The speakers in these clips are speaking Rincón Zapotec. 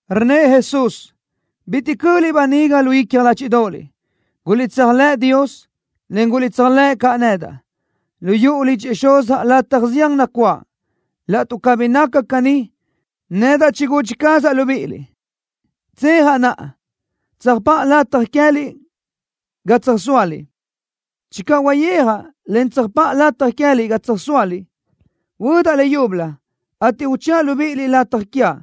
Rnnëʼ Jesús: —Bitiʼ cöʼliʼ baniga lu icja ládxiʼdoʼoliʼ. Guliʼtséajlëʼ Dios, en guliʼtséajlëʼ caʼ nedaʼ. Lu yuʼu lidxëʼ Xuzaʼ lataj zián nacuáʼ. Laʼtuʼ cabí naca caní, nedaʼ chigudxi cazaʼ libíʼiliʼ. Tsejaʼ naʼa, tsöjpáʼa lataj queë́liʼ ga tsöjsóaliʼ. Channö huayéajaʼ, en tsöjpáʼa lataj queë́liʼ ga tsöjsóaliʼ, huödaʼ leyúbölö, ateʼ uchëʼa libíʼiliʼ lataj quiaʼ,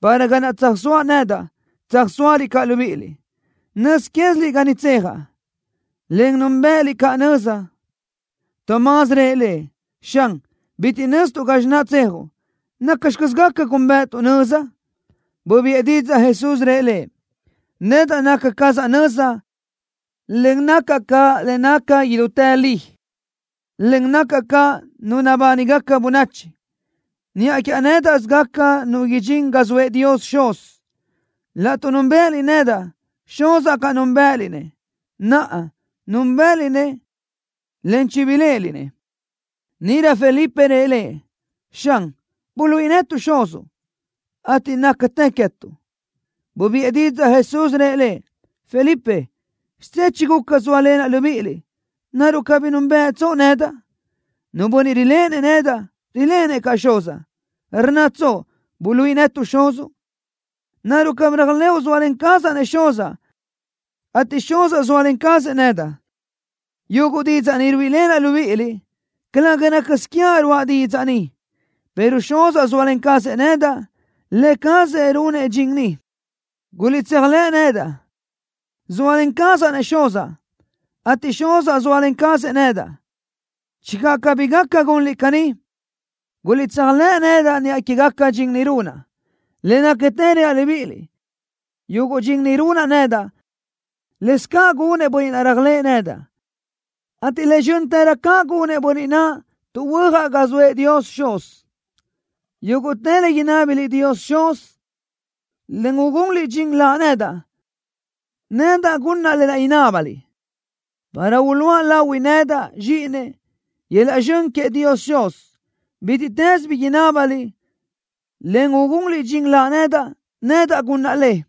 para ga naʼ tsöjsóaʼ nedaʼ, tsöjsóaliʼ caʼ libíʼiliʼ. Nöz quéziliʼ ga niʼ tsejaʼ, en núnbëʼëliʼ caʼ nöza. Tomás rëʼ Lëʼ: —Xan, bitiʼ nöztuʼ gazxi naʼ tsejuʼ. ¿Nacxi caz gaca gúnbëʼëtuʼ nöza? Bubiʼë didzaʼ Jesús, rëʼ lëʼ: —Nedaʼ naca cazaʼ nöza, en nacaʼ caʼ le naca idútë li, en nacaʼ caʼ Nu nabánigaca bönachi. Niʼa quiaʼ nédaʼsö gaca nu idxín ga zoëʼ Dios Xuz. Laʼtuʼ núnbëʼëliʼ nedaʼ, Xuzaʼ caʼ núnbëʼëliʼ-nëʼ. Naʼa, núnbëʼëliʼ-nëʼ, en chibiléʼeliʼ-nëʼ. Níʼirö Felipe rëʼ Lëʼ: —Xan, buluíʼi netuʼ Xuzuʼ, ateʼ nácatë queë́tuʼ. Bubiʼë didzaʼ Jesús, rëʼ lëʼ: —Felipe, xidzé chiguca zóalenaʼ libíʼiliʼ. ¿Naruʼ cabí núnbëʼëtsoʼ nedaʼ? Nu bönniʼ riléʼenëʼ nedaʼ, riléʼenëʼ caʼ Xuzaʼ. ¿Rnnatsoʼ: “Buluíʼi netuʼ Xuzuʼ”? ¿Naruʼ cabí réajlëʼu zóalen cazaʼ-nëʼ Xuzaʼ, ateʼ Xuzaʼ zóalen cazëʼ nedaʼ? Yuguʼ didzaʼ ni ruíʼilenaʼ libíʼiliʼ, calëga rácasö quiaʼ ruáʼa didzaʼ ni, pero Xuzaʼ zóalen cazëʼ nedaʼ, Lë cazëʼ runëʼ dxin ni. Guliʼtséajlëʼ nedaʼ, zóalen cazaʼ-nëʼ Xuzaʼ, ateʼ Xuzaʼ zóalen cazëʼ nedaʼ. Channö cabí gaca gunliʼ caní, guliʼtséajlëʼ nedaʼ niʼa quégaca dxin ni runaʼ. Le nácatë reaʼ libíʼiliʼ: Yuguʼ dxin ni runaʼ nedaʼ, lëscaʼ gunëʼ bönniʼ naʼ réajlëʼë nedaʼ, ateʼ le zxö́ntërö caʼ gunëʼ bönniʼ naʼ tuʼ huöjaʼ ga zoëʼ Dios Xuz. Yúguʼtë le inábiliʼ Dios Xuz, en ugunliʼ dxin Laʼ nedaʼ, nedaʼ gunaʼ lë naʼ inábaliʼ, para uluʼa lahui nedaʼ, Zxíʼinëʼ, yöl-laʼ zxön queëʼ Dios Xuz. Bítiʼtës bi inábaliʼ, en ugunliʼ dxin Laʼ nedaʼ, nedaʼ gunaʼ le.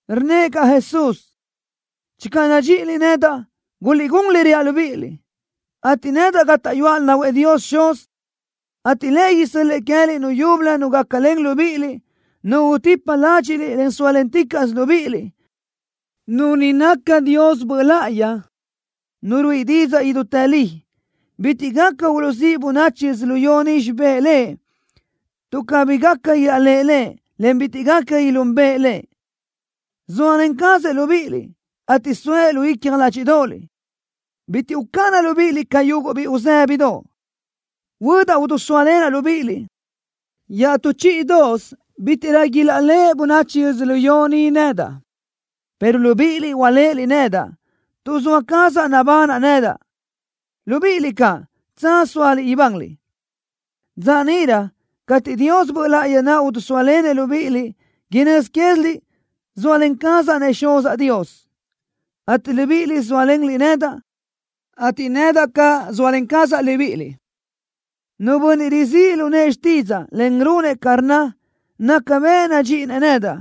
Rnnëʼ caʼ Jesús: —Channö nadxíʼiliʼ nedaʼ, guliʼgún le reaʼ libíʼiliʼ, ateʼ nedaʼ gátaʼyuaʼ lahuëʼ Dios Xuz, ateʼ Lëʼ isö́l-lëʼë queë́liʼ Nu yúbölö Nu gácalen libíʼiliʼ, Nu utipa ládxiʼliʼ, en sóalenticaʼsö libíʼiliʼ. Nu ni naca Dios Böʼ Láʼayi, Nu ruíʼi didzaʼ idútë li. Bitiʼ gaca uluʼzíʼ bönachi yödzölió ni xibë́ʼ Lëʼ, tuʼ cabí gaca ilaʼléʼe Lëʼ, en bitiʼ gaca ilúnbeʼe Lëʼ. Zóalen cazëʼ libíʼiliʼ, ateʼ soëʼ lu icja ládxiʼdoʼoliʼ. Bitiʼ ucáʼanaʼ libíʼiliʼ ca yuguʼ biʼi uzë́bidoʼ. Huödaʼ udusóalenaʼ libíʼiliʼ. Iaʼtú chíʼidoʼosö bítiʼrö ilaʼléʼe bönachi yödzölió ni nedaʼ, pero libíʼiliʼ uléʼeliʼ nedaʼ. Tuʼ zoa cazaʼ nabanaʼ nedaʼ, libíʼiliʼ caʼ, tsaz sóaliʼ ibanliʼ. Dza níʼirö cateʼ Dios Böʼ Láʼayi naʼ idisóalenëʼ libíʼiliʼ, inö́z quéziliʼ zóalen cazaʼ-nëʼ Xuzaʼ Dios, ateʼ libíʼiliʼ zóalenliʼ nedaʼ, ateʼ nedaʼ caʼ zóalen cazaʼ libíʼiliʼ. Nu bönniʼ rizíʼ lu nëʼë xtídzaʼa, en runëʼ ca rnna, naca bëʼ nadxíʼinëʼ nedaʼ.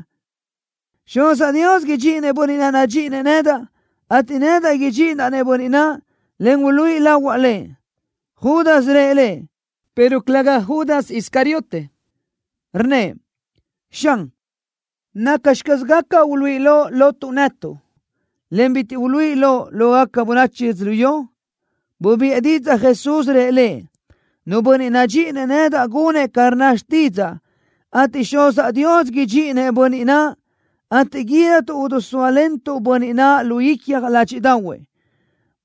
Xuzaʼ Dios idxíʼinëʼ bönniʼ naʼ nadxíʼinëʼ nedaʼ, ateʼ nedaʼ idxíʼidaʼ-nëʼ bönniʼ naʼ, en uluíʼi lahuaʼ lahuëʼ. Judas rëʼ lëʼ, pero calëga Judas Iscariote, rnnëʼ: —Xan, ¿nacxi caz gaca uluíʼi loʼ lotuʼ netuʼ, en bitiʼ uluíʼi loʼ lógaca bönachi yödzölió? Bubiʼë didzaʼ Jesús, rëʼ lëʼ: —Nu bönniʼ nadxíʼinëʼ nedaʼ gunëʼ ca rnna xtídzaʼa, ateʼ Xuzaʼ Dios idxíʼinëʼ bönniʼ naʼ, ateʼ guídatuʼ idisóalentuʼ-nëʼ bönniʼ naʼ lu icja ládxiʼdaʼahuëʼ.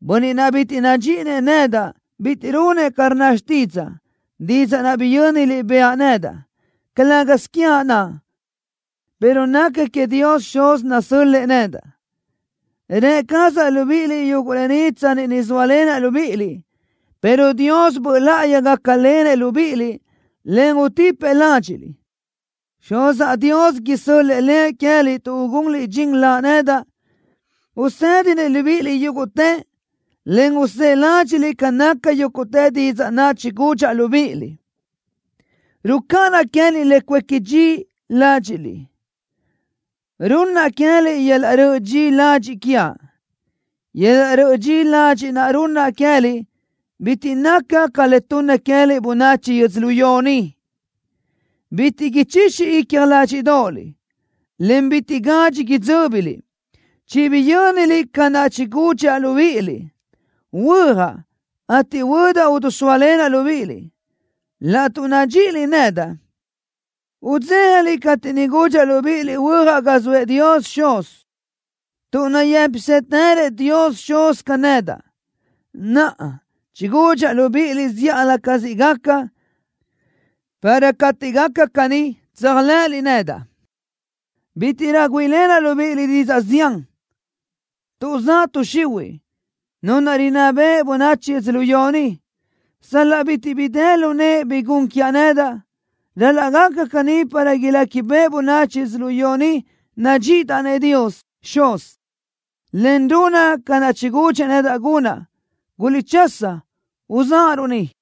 Bönniʼ naʼ bitiʼ nadxíʼinëʼ nedaʼ bitiʼ runëʼ ca rnna xtídzaʼa. Didzaʼ naʼ biyö́niliʼ bëʼa nedaʼ, calë́gasö quiaʼ naʼ, pero naca queëʼ Dios Xuz nasö́l-lëʼë nedaʼ. ’Rë cazaʼ libíʼiliʼ yuguʼ lë ni tsanni ni zóalenaʼ libíʼiliʼ, pero Dios Böʼ Láʼayi gácalenëʼ libíʼiliʼ, en utipëʼ ládxiʼliʼ. Xuzaʼ Dios isö́l-lëʼë Lëʼ queë́liʼ tuʼ ugunliʼ dxin Laʼ nedaʼ. Usédinëʼ libíʼiliʼ yúguʼtë, en usë́ʼë ládxiʼliʼ ca naca yúguʼtë didzaʼ naʼ chigudxaʼ libíʼiliʼ. ’Rucáʼanaʼ queë́liʼ le cuéqui dxi ládxiʼliʼ. Runnaʼ queë́liʼ yöl-laʼ röʼö dxi ladxiʼ quiaʼ. Yöl-laʼ röʼö dxi ladxiʼ naʼ runnaʼ queë́liʼ bitiʼ naca ca le tunna queë́liʼ bönachi yödzölió ni. Bitiʼ ichixi icja ládxiʼdoʼoliʼ, en bitiʼ gadxi idzö́biliʼ. Chibiyö́niliʼ ca naʼ chigudxaʼ libíʼiliʼ: Huöjaʼ, ateʼ huödaʼ udusóalenaʼ libíʼiliʼ. Laʼtuʼ nadxíʼiliʼ nedaʼ, udzéjaliʼ cateʼ niʼ gudxaʼ libíʼiliʼ huöjaʼ ga zoëʼ Dios Xuz, tuʼ nayë́pisëtërëʼ Dios Xuz ca nedaʼ. Naʼa, chigudxaʼ libíʼiliʼ zíʼalö ca siʼ gaca, para cateʼ gaca caní, tséajlëʼëliʼ nedaʼ. ’Bítiʼrö güíʼilenaʼ libíʼiliʼ didzaʼ zián, tuʼ zaʼ tuʼ xihuiʼ, nu rinná beʼe bönachi yödzölió ni. Sal-laʼ bitiʼ bi dë lu nëʼe bi gun quiaʼ nedaʼ, ral-laʼ gaca caní para iléquibeʼe bönachi yödzölió ni nadxíʼidaʼ-nëʼ Dios Xuz, en runaʼ ca naʼ chigudxëʼ nedaʼ gunaʼ. Guliʼchasa, uzáʼaruʼ ni.